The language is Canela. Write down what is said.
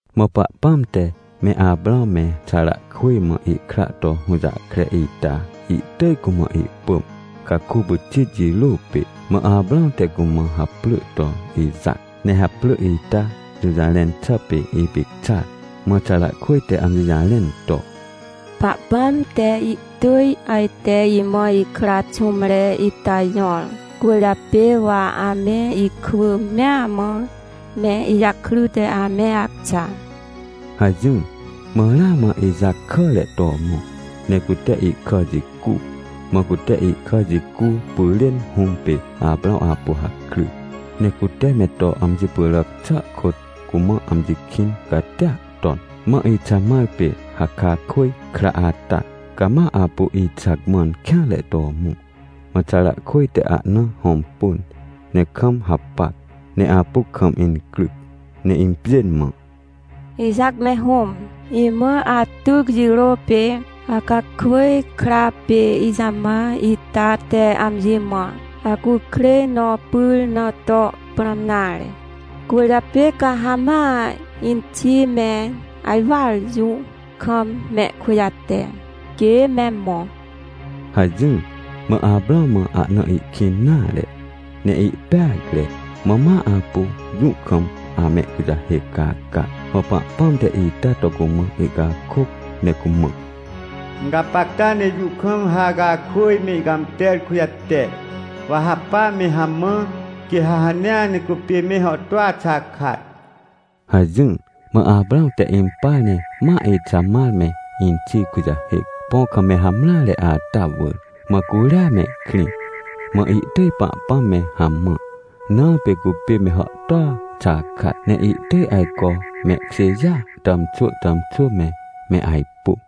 Mã Pahpãm te me Aprãw me Xarakwỳj mã ihkra to hũjahkre ita ihtỳj cumã ihpỳm, caku pyxit jirô pê. Mã Aprãw te cumã haprỳ to Ixac, ne haprỳ ita jũjarẽn xà pê “Ipicxar”. Mã Xarakwỳj te amji jarẽn to: — Pahpãm te ihtỳj ajte imã ikra xũmre ita jõr, cwỳrjapê wa ame ikwỳ mea mã, me ijakryte ame acxa — hajỹr. Mã ramã Ixac kàre to mõ, ne cute ihkà jicu. Mã cute ihkà jicu pyrên hũm pê Aprãw apu hakry, ne cute me to amji pyràc xà kôt, cumã amji kĩn catia ton. Mã Ixamar pê Hacakwỳj kra ata, cama apu Ixac mãn kêanre to mõ. Mã Xarakwỳj te ahna hõmpun, ne kam hapac, ne apu kam incryc ne impjên mã: — Ixac me hũm, imã atyc jirô pê Hacakwỳj kra pê Ixamar ita te amji mã acukrêj nõ pyr na to prãm nare. Cwỳrjapê ca ha ma inxi me ajwar jũ kam mehkujate, quê me mõ — hajỹr. Mã Aprãw mã ahna ihkĩn nare, ne ihpeacre. Mã ma apu jũ kam amehkujahêc caca. Mã Pahpãm te ita to cumã ihcakôc ne cumã: — Gapacta ne jũ kam Hacakwỳj me ihcãmter kujate. Wa ha pa me hamã, quê ha hanea cupê me hàhtôa xakat — hajỹr. Mã Aprãw te impar ne ma Ixamar me inxi kujahêc, põ kam me hamreare ata wỳr. Mã curia mehkrĩ, mã ihtỳj Pahpãm me hamã. Na pê cupê me hàhtôa xakat ne ihtỳj ajco mehkjêjêa tàmxwỳ tàmxwỳ me, me ajpu.